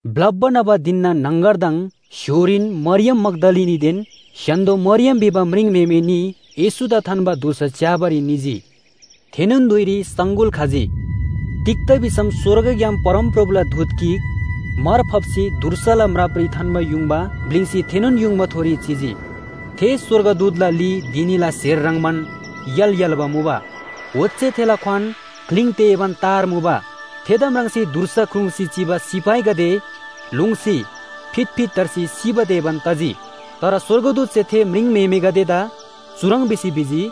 ब्‍लप्‍बा न्‍हबा धिनना न्‍हङगरदङ स्‍य्‍होरीन मरियम मग्‍दलिनीदेन स्‍य्‍हान्‍दो मरियम भिबा म्रिङम्‍हेमे न्‍ही येशूदा थान्‍बा धुर्सा च्‍याबारी निजी। थेनोन धुइरी सङगुल खजी। तिग्‍दा भिसम स्‍वर्गग्‍याम परमप्रभुला दूत गिक मार फाप्‍सी धुर्साला म्रापरी थान्‍बा युङबा ब्‍लिङ्सी थेनोन युङबाथोरी चिजी। थे स्‍वर्गदूतला ली धिनीला स्‍हेर ह्रङ्‌बान य्‍हाल य्‍हाल्‍बा मुबा। ओच्‍छे थेला क्‍वान ग्‍लिङ तेबान तार मुबा। थेदा म्राङ्सी धुर्सा ख्रुङ्‌सी चिबा सिपाहीगदे लोङ्सी फितफित धर्सी सिबा तेबान तजी। तर स्‍वर्गदूतसे थे म्रिङम्‍हेमेगदेदा चुह्रङ् भिसी भिजी,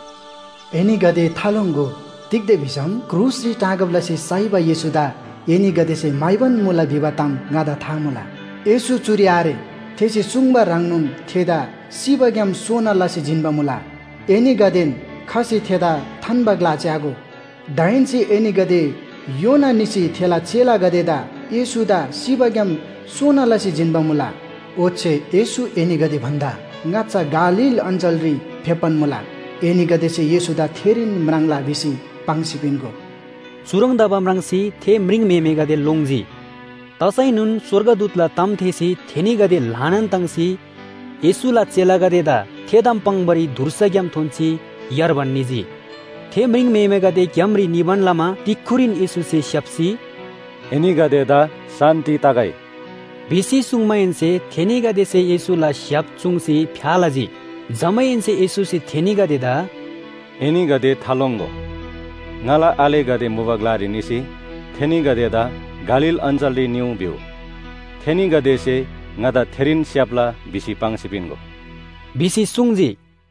“एनीगदे थालोङ्‍गो, तिग्‍दा भिसम क्रुसरी टाँगब लसी साइबा येशूदा एनीगदेसे म्‍हाइबान मुला भिबा ताम ङादा था मुला। येशू चुरी आरे, थेसे सुङ्बा ह्रङ्नोन थेदा सिबाग्‍याम सोना लसी जिन्‍बा मुला। एनीगदेन खसी थेदा थान्‍बा ग्‍ला च्‍यागो। दाहेन्‍से एनीगदे योना निसी थेला चेलागदेदा ‘येशूदा सिबाग्‍याम सोना लसी जिन्‍बा मुला। ओच्‍छे येशू एनीगदे भन्‍दा ङाच्‍छा गालील अञ्‍चलरी फेप्‍बान मुला। एनीगदेसे येशूदा थेरीन म्राङ्ला’ भिसी पाङ्सी पिन्‍गो।” चुह्रङ् तबा म्राङ्सी थे म्रिङम्‍हेमेगदे लोङ्जी। तसैनोन स्‍वर्गदूतला ताम थेःसी थेनीगदे ल्‍हानान ताङ्सी येशूला चेलागदेदा थे ताम पाङ्‌बारी धुर्साग्‍याम थोन्‍सी यार्बान निजी। थे म्रिङम्‍हेमेगदे ग्‍यामरी निबान लमा तिक्‍खुरीन येशूसे स्‍याप्‍सी “एनीगदेदा शान्‍ति तगै” भिसी सुङ्माहेन्‍से थेनीगदेसे येशूला स्‍य्‍हाप चुङ्सी फ्‍या लजी। जमाहेन्‍से येशूसे थेनीगदेदा “एनीगदे थालोङ्‍गो, ङाला आलेगदे मुबा ग्‍लारी निसी थेनीगदेदा गालील अञ्‍चलरी निउ भिउ, थेनीगदेसे ङादा थेरीन स्‍याप्‍ला भिसी पाङ्सी पिन्‍गो” भिसी सुङ्जी।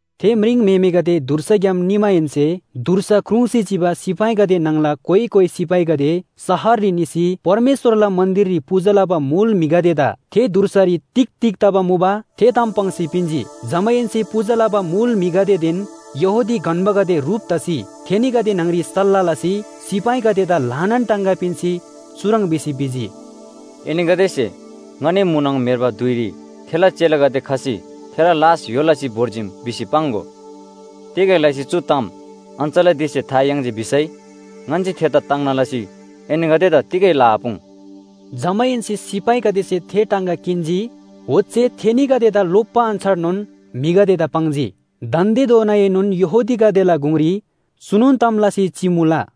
थे म्रिङम्‍हेमेगदे धुर्साग्‍याम निमाहेन्‍से धुर्सा ख्रुङ्‌सी चिबा सिपाहीगदे न्‍हङला कोइ कोइ सिपाहीगदे शहररी निसी परमेश्‍वरला मन्‍दिररी पूजा लबा मुल म्‍हिगदेदा थे धुर्सारी तिग तिग तबा मुबा, थे ताम पाङ्सी पिन्‍जी। जमाहेन्‍से पूजा लबा मुल म्‍हिगदेदेन यहूदी गन्‍बागदे ह्रुप तसी थेनीगदे न्‍हङ‍री सल्‍लाह लसी सिपाहीगदेदा ल्‍हानान टाङगा पिन्‍सी चुह्रङ् भिसी भिजी, “एनीगदेसे ‘ङनी म्‍हुनङ म्‍हेर्बा धुइरी थेला चेलागदे खसी थेला लास य्‍हो लसी भोर्जीम’ भिसी पाङ्‍गो। तिगै लसी चु ताम अञ्‍चलाधीशसे था याङ्जी भिसै ङन्‍से थेदा ताङ्ना लसी एनीगदेदा तिगै लआपुङ्।” जमाहेन्‍से सिपाहीगदेसे थे टाङगा किन्‍जी, ओच्‍छे थेनीगदेदा लोप्‍बा अन्‍छारनोन म्‍हिगदेदा पाङ्जी। दान्‍देधोनाएनोन यहूदीगदेला गुङरी चुनोन ताम लसी चिमुला।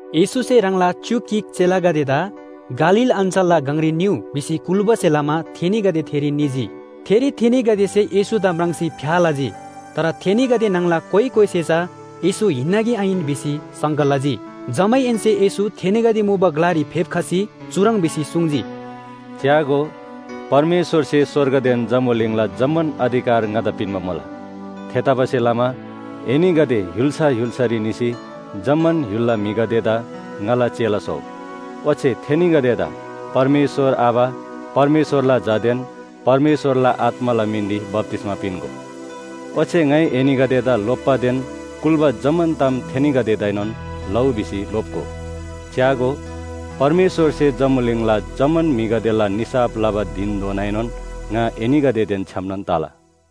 येशूसे ह्राङला च्‍युक गिक चेलागदेदा “गालील अञ्‍चलला गङरी निउ” भिसी कुल्‍बासे लमा थेनीगदे थेरी निजी। थेरी थेनीगदेसे येशूदा म्राङ्सी फ्‍या लजी। तर थेनीगदे न्‍हङला कोइ कोइसे चा येशू हिन्‍ना कि आहिन भिसी शङ्का लजी। जमाहेन्‍से येशू थेनीगदे मुबा ग्‍लारी फेप्‍खसी चुह्रङ् भिसी सुङ्जी, “च्‍यागो, परमेश्‍वरसे स्‍वर्गदेन जम्‍बुलिङला जम्‍मान अधिकार ङादा पिन्‍बा मुला। थेतबासेलमा एनीगदे य्‍हुल्‍सा य्‍हुल्‍सारी निसी जम्‍मान य्‍हुलला म्‍हिगदेदा ङाला चेला स्‍होउ। ओच्‍छे थेनीगदेदा परमेश्‍वर आबा, परमेश्‍वरला झादेन परमेश्‍वरला आत्‍माला मिनरी बप्‍तिस्‍मा पिन्‍गो, ओच्‍छे ङाइ एनीगदेदा लोप्‍बादेन कुल्‍बा जम्‍मान ताम थेनीगदेदाएनोन लउ भिसी लोप्‍गो। च्‍यागो, परमेश्‍वरसे जम्‍बुलिङला जम्‍मान म्‍हिगदेला निसाफ लबा धिनधोनाएनोन ङा एनीगदेदेन छ्‌यामनोन तला।”